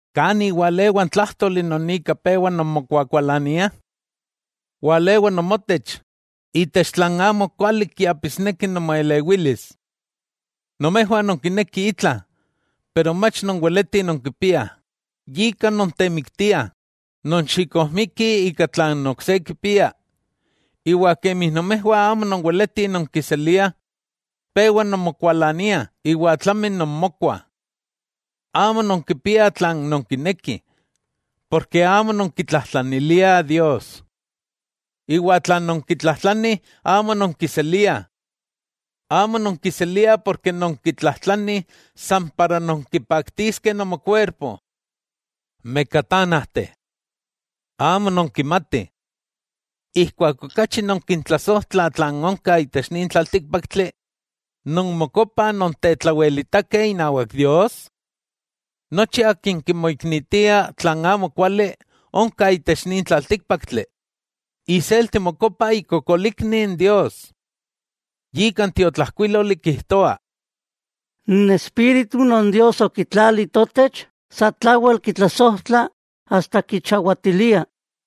¿Kani walewa n tlájtoli non ika pewa nonmokuakualaniah? Walewa nomotech, itech tlan amokuali kiapisneki nomoelewilis. Nomejwah nonkinekih itla, pero mach nonweletih nonkipiah, yika nontemiktiah, nonxikojmikih ika tlan ok se kipia, iwa kemi nomejwah amo nonweletih nonkiseliah, pewa nonmokualaniah iwa tlami nonmokuah. Amo nonkipiah tlan nonkinekih, porke amo nonkitlajtlaniliah Dios. Iwa tlan nonkitlajtlanih amo nonkiseliah. Amo nonkiseliah porke nonkitlajtlanih san para nonkipaktiskeh nomokuerpo. ¡Mekatánajteh! ¿Amo nonkimatih, ijkuak okachi nonkitlasojtlah tlan onka itech nin tlaltíkpaktli nonmokopah nontetlawelitakeh inawak Dios? Nochi akin kimoknitia tlan amokuali onka itech nin tlaltíkpaktli, iselti mokopa ikokolikni n Dios. Yika n tiotlajkuíloli kijtoa: “N espíritu non Dios okitlali totech, satlawel kitlasojtla asta kichawatilia.”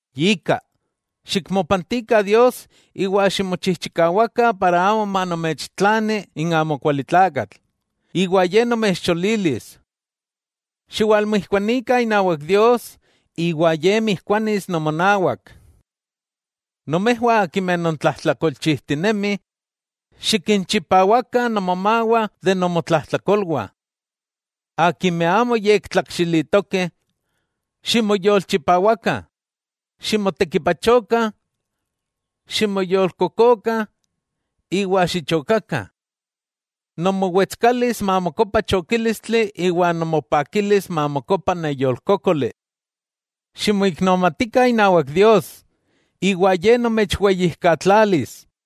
Yika, xikmopantikah Dios iwa ximochijchikawakah para amo manomechtlani n amokualitlakatl, iwa ye nomechcholilis. Xiwalmijkuanikah inawak Dios, iwa Ye mijkuanis nomonawak. ¡Nomejwah akimeh nontlajtlakolchijtinemih, xikinchipawakah nomomawah de nomotlajtlakolwah. Akimeh amo yektlakxilitokeh, ximoyolchipawakah! Ximotekipachokah, ximoyolkokokah iwa xichokakah. Nomowetskalis mamokopa chokílistli iwa nomopakilis mamokopa neyolkókoli. Ximoiknomatikah inawak Dios, iwa Ye nomechweyijkatlalis.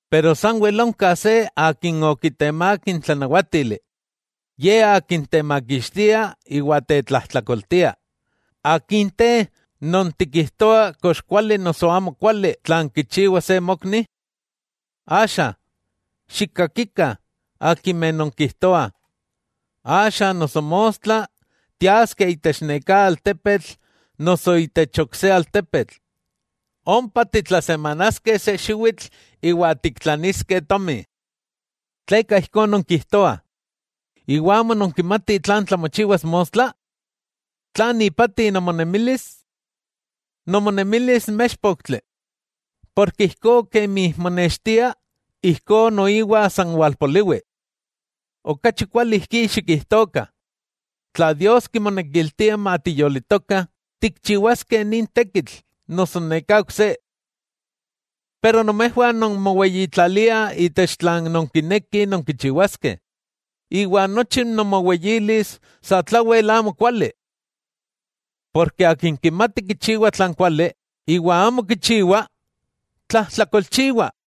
Pero sanwel onka se Akin okitemák n tlanawátili, Ye Akin temakixtia iwa tetlajtlakoltia, ¿akin te non tikijtoa kox kuali noso amo kuali tlan kichiwa se mokni? Axa, xikkakikah akimeh nonkijtoah: “Axa noso mostla, tiaskeh itech neká altepetl noso itech ok se altepetl; ompa titlasemanaskeh se xiwitl iwa tiktlaniskeh tomi.” ¿Tleka ijkó nonkijtoah, iwa amo nonkimatih tlan tlamochiwas mostla?, ¿tlan ipati nomonemilis?, nomonemilis méxpoktli: porke ijkó kemi monextia, ijkó noiwa san walpoliwi. Okachi kuali ijkí xikijtokah: “Tla Dios kimonekiltia matiyolitokah, tikchiwaskeh nin tekitl noso neká ok se.” Pero nomejwah non moweyitlaliah itech tlan nonkinekih nonkichiwaskeh, iwa nochi nomoweyilis satlawel amo kuali. Porke akin kimati kichiwa tlan kuali, iwa amo kichiwa, tlajtlakolchiwah.